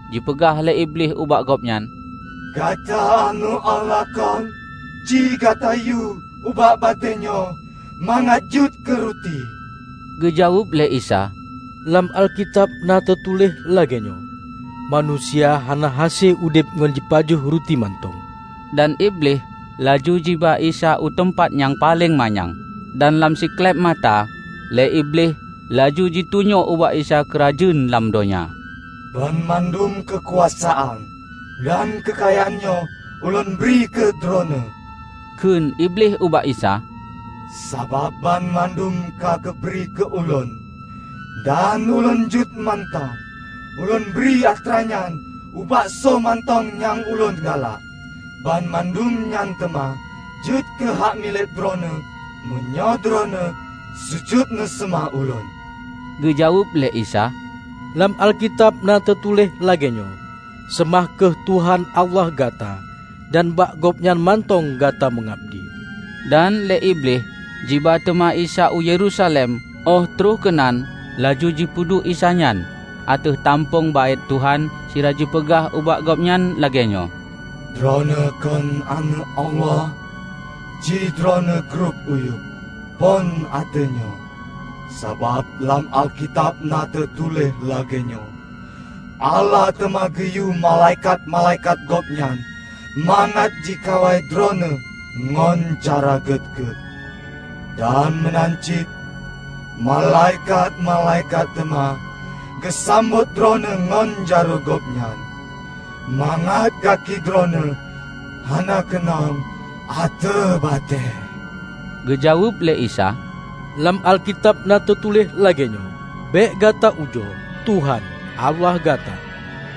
Jipeugah lé Iblih ubak Gobnyan, "Gata Aneuëk Allah, kon? Ci gatayue ubak batée nyoe mangat jeuet keuruti." Geujaweueb lé Isa, "Lam Alkitab na teutuléh lagée nyoe, 'Manusia hana hase udeb ngon jipajoh ruti mantong.' " Dan Iblih laju jiba Isa u teumpat nyang paleng manyang, dan lam sikléb mata lé Iblih laju jitunyok ubak Isa keurajeuen lam donya. "Banmandum keukuasaan dan keukayaan nyoe ulôn bri keu Droeneueh," kheun Iblih ubak Isa, "Sabab banmandum ka geubri keu ulôn dan ulôn jeuet mantong ulôn bri atranyan ubak soe mantong nyang ulôn galak. Banmandum nyan teuma jeuet keuhak milék Droeneueh, meunyoe Droeneueh sujut neuseumah ulôn." Geujaweueb lé Isa, "Lam Alkitab na teutuléh lagée nyoe, 'Seumah kheueh Tuhan Allah gata dan bak gobnyan mantong gata meungabdi.' " Dan lé Iblih jiba teuma Isa u Yerusalem óh troh keunan laju jipeuduek Isa nyan ateueh tampöng Baét Tuhan sira jipeugah ubak Gobnyan lagée nyoe, "Droeneueh kon Aneuëk Allah? Ci Droeneueh grob uyueb phon ateueh nyoe. Sabab lam Alkitab na teutuléh lagée nyoe, 'Allah teuma geuyue malaikat-malaikat Gobnyan mangat jikawai droeneueh ngon cara gét-gét.' Dan meunan cit, 'Malaikat-malaikat teuma geusambot droeneueh ngon jaroe gobnyan, mangat gaki droeneueh hana keunong ateueh batée.' " Geujaweueb lé Isa, "Lam Alkitab na teutuléh lagée nyoe, 'Bék gata ujoe, Tuhan, Allah gata.' "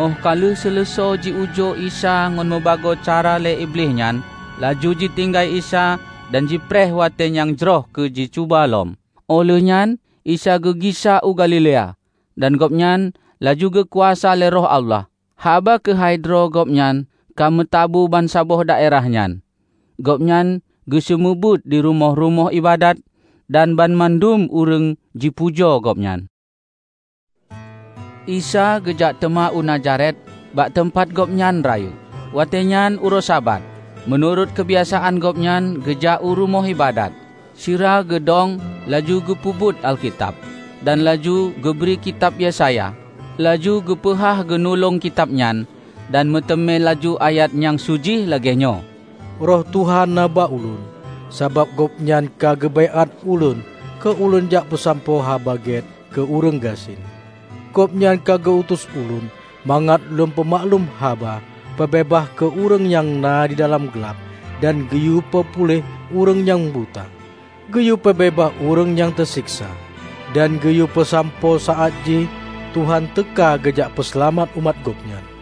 Óh ka lheueh seuleusoe jiujoe Isa ngon mubagoe cara lé Iblih nyan, laju jitinggai Isa dan jipreh watée nyang jroh keu jicuba lom. Óh lheuehnyan Isa geugisa u Galilea; dan Gobnyan laju geukuasa lé Roh Allah. Haba keuhai droe Gobnyan ka meutabu bansaboh daerah nyan. Gobnyan geuseumeubeuet di rumoh-rumoh iébadat, dan banmandum ureuëng jipujoe Gobnyan. Isa geujak teuma u Nazaret, bak teumpat Gobnyan rayeuk. Watée nyan uroe Sabat, meunurot keubiasaan Gobnyan geujak u rumoh iébadat. Sira geudong laju geubeuet Alkitab, dan laju geubri kitab Yesaya. Laju geupeuhah gunulong kitab nyan, dan meuteumé laju ayat nyang su jih lagée nyoe, "Roh Tuhan na bak Ulôn, sabab Gobnyan ka geubaiát Ulôn keu lôn jak peusampoe Haba Gét keu ureuëng gasien. Gobnyan ka geu-utus Ulôn mangat lôn peumaklum haba peubeubaih keu ureuëng nyang na didalam glab dan geuyue peupuléh ureuëng nyang buta; geuyue peubeubaih ureuëng nyang teuseksa dan geuyue peusampoe saát jih Tuhan teuka geujak peuseulamat umat Gobnyan."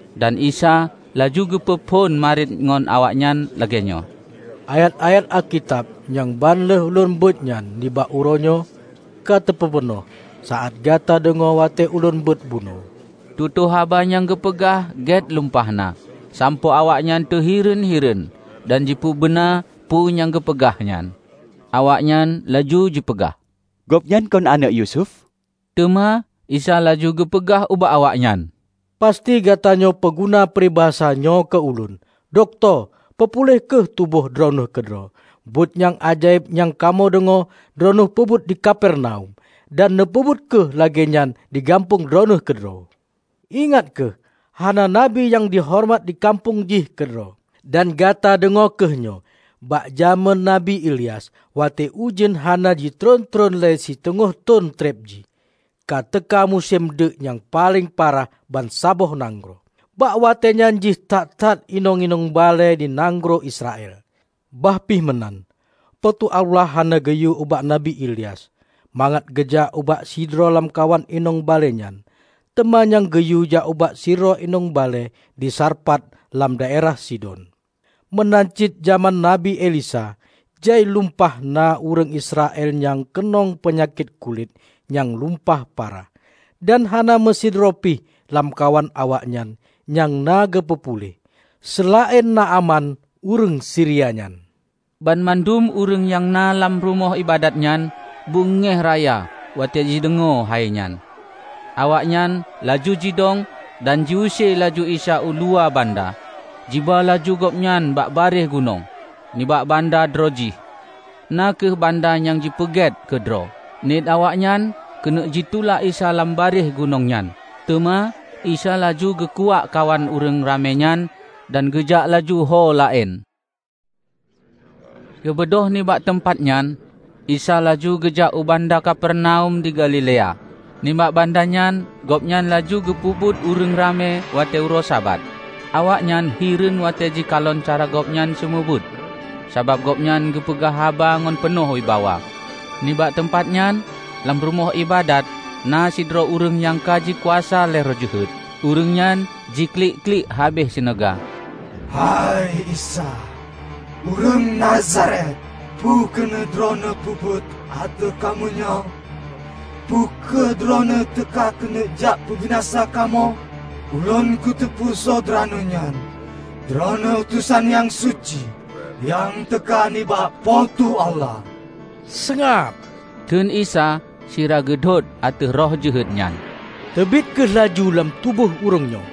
Dan Isa laju geupeu phon mariet ngon awaknyan lagée nyoe, "Ayat-ayat Alkitab nyang ban lheueh ulôn beuet nyan nibak uroenyoe ka teupeupeunoh saát gata deungoe watée ulôn beuet bunoe." Tutoe haba nyang geupeugah gét lumpah na, sampoe awaknyan teuhireuen-hireuen dan jipeubeuna peue nyang geupeugah nyan. Awaknyan laju jipeugah, "Gobnyan kon aneuëk Yusuf?" Teuma Isa laju geupeugah ubak awaknyan, "Pasti gatanyoe peuguna pribasa nyoe keu Ulôn, 'Dokto, peupuléh kheueh tuboh droeneueh keudroe. Buet nyang ajaéb nyang kamoe deungoe droeneueh peubuet di Kapernaum, dan neupeubuet kheueh lagée nyan di gampông Droeneueh keudroe.' " "Ingat kheueh, hana Nabi nyang jihoreumat di gampông jih keudroe. Dan gata deungoe kheueh nyoe: bak jamén Nabi Ilyas, watée ujeuen hana jitôh-tôh lhée siteungoh thon treb jih, ka teuka musém deuk nyang paleng parah bansaboh nanggroe. Bak watée nyan jai that-that inong-inong balée di nanggroe Israel. Bah pih meunan, Po teu Allah hana geuyue ubak Nabi Ilyas mangat geujak ubak sidroe lamkawan inong balée nyan teuma nyang geuyue jak ubak sidroe inong balée di Sarfat lam daerah Sidon. Meunan cit jamén Nabi Elisa jai lumpah na ureuëng Israel nyang keunong peunyakét kulét nyang lumpah parah, dan hana meusidroe pih lamkawan awaknyan nyang na geupeu puléh, seulaén Naaman ureuëng Siria nyan." Banmandum ureuëng nyang na lam rumoh iébadat nyan beungéh raya watée jideungoe hainyan. Awaknyan laju jidong dan jiuse laju Isa u luwa banda, jiba laju gobnyan bak barieh gunong, nibak banda droejih, na kheueh banda nyang jipeugét keudroe. Niet awaknyan keuneuk jitulak Isa lam barieh gunong nyan. Teuma Isa laju geukuwak kawan ureuëng ramé nyan dan geujak laju ho laén. Geubeudôh nibak teumpat nyan Isa laju geujak u banda Kapernaum di Galilea. Nibak banda nyan gobnyan laju geupeubeuet ureuëng ramé watée uroe Sabat. Awaknyan hireuen watée jikalon cara Gobnyan seumeubeuet, sabab Gobnyan geupeugah haba ngon peunoh wibawa. Nibak teumpat nyan, lam rumoh iébadat na sidroe ureuëng nyang ka jikuasa lé roh jeuhet. Ureuëng nyan jiklik-klik habéh sineuga, "Hei Isa, ureuëng Nazaret, peue keuneuk Droeneueh peubuet ateueh kamoe nyoe? Peu kheueh Droeneueh teuka keuneuk jak peubinasa kamoe? Ulôn kuteupeu soe Droeneueh nyan: Droeneueh utosan nyang suci nyang teuka nibak Po teu Allah!" "Seungab!" kheun Isa sira geudhôt ateueh roh jeuhet nyan. "Teubiet kheueh laju lam tuboh ureuëng nyoe!"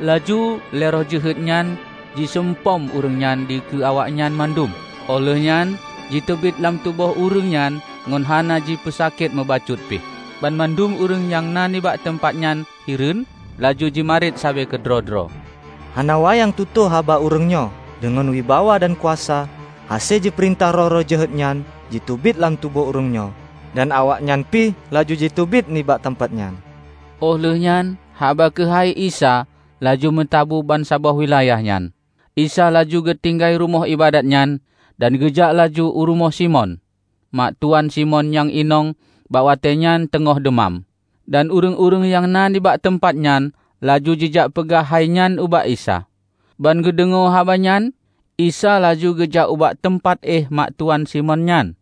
Laju lé roh jeuhet nyan jiseumpom ureuëng nyan dikeue awaknyan mandum, óh lheueh nyan jiteubiet lam tuboh ureuëng nyan ngon hana jipeusakét mubacut pih. Banmandum ureuëng nyang na nibak teumpat nyan hireuen, laju jimarit sabe keudroe-droe, "Hana wayang tutoe haba ureuëng nyoe. Deungon wibawa dan kuasa, hase jipeurintah roh-roh jeuhet nyan jiteubiet lam tuboh ureuëng nyoe, dan awaknyan pih laju jiteubiet nibak teumpat nyan!" Óh lheuehnyan haba keuhai Isa laju meutabu bansaboh wilayah nyan. Isa laju geutinggai rumoh iébadat nyan, dan geujak laju u rumoh Simon. Ma tuwan Simon nyang inong bak watée nyan teungon deumam, dan ureuëng-ureuëng nyang na nibak teumpat nyan laju jijak peugah hainyan ubak Isa. Ban geudeungoe haba nyan, Isa laju geujak ubak teumpat éh mak tuwan Simon nyan,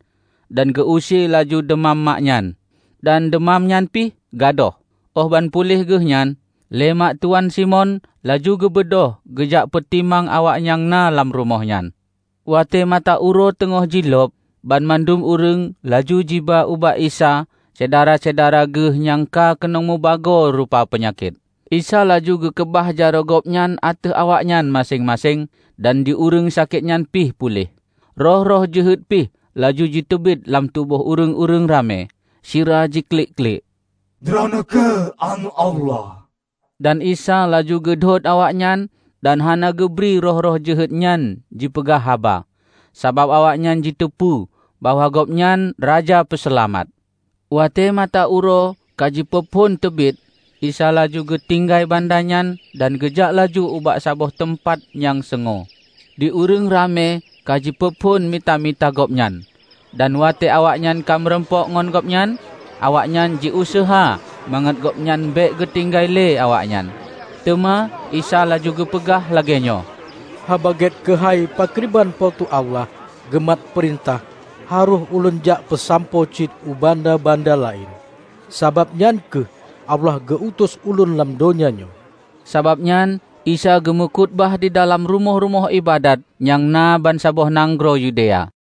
dan geu-use laju deumam mak nyan. Dan deumam nyan pih gadôh, óh banpuléh geuhnyan, lé mak tuwan Simon laju geubeudôh geujak peutimang awak nyang na lam rumoh nyan. Watée mata uroe teungoh jilôb, banmandum ureuëng laju jiba ubak Isa syedara-syedara geuh nyang ka keunong mubagoe rupa peunyakét. Isa laju geukeubah jaroe gobnyan ateueh awaknyan maséng-maséng dan di ureuëng sakét nyan pih puléh. Roh-roh jeuhet pih laju jiteubiet lam tuboh ureuëng ramé, sira jiklik-klik, "Droeneueh kheueh Aneuëk Allah!" Dan Isa laju geudhôt awaknyan dan hana geubri roh-roh jeuhet nyan jipeugah haba, sabab awaknyan jiteupeu bahwa gobnyan Raja Peuseulamat. Watée mata uroe kajipeuphon teubiet Isa laju geutinggai banda nyan dan geujak laju ubak saboh teumpat nyang seungue. Di ureuëng ramé kajipeuphon mita-mita Gobnyan, dan watée awaknyan ka meurumpok ngon gobnyan, awaknyan jiuseuha mangat gobnyan bék geutinggai lé awaknyan. Teuma Isa laju geupeugah lagée nyoe, "Haba Gét keuhai pakriban Po teu Allah geumat peurintah harôh ulôn jakpeusampoe cit u banda-banda laén, sabab nyan kheueh Allah geu-utus Ulôn lam donya nyoe." Sabab nyan Isa geumeukhutubah didalam rumoh-rumoh iébadat nyang na bansaboh nanggroe Yudea.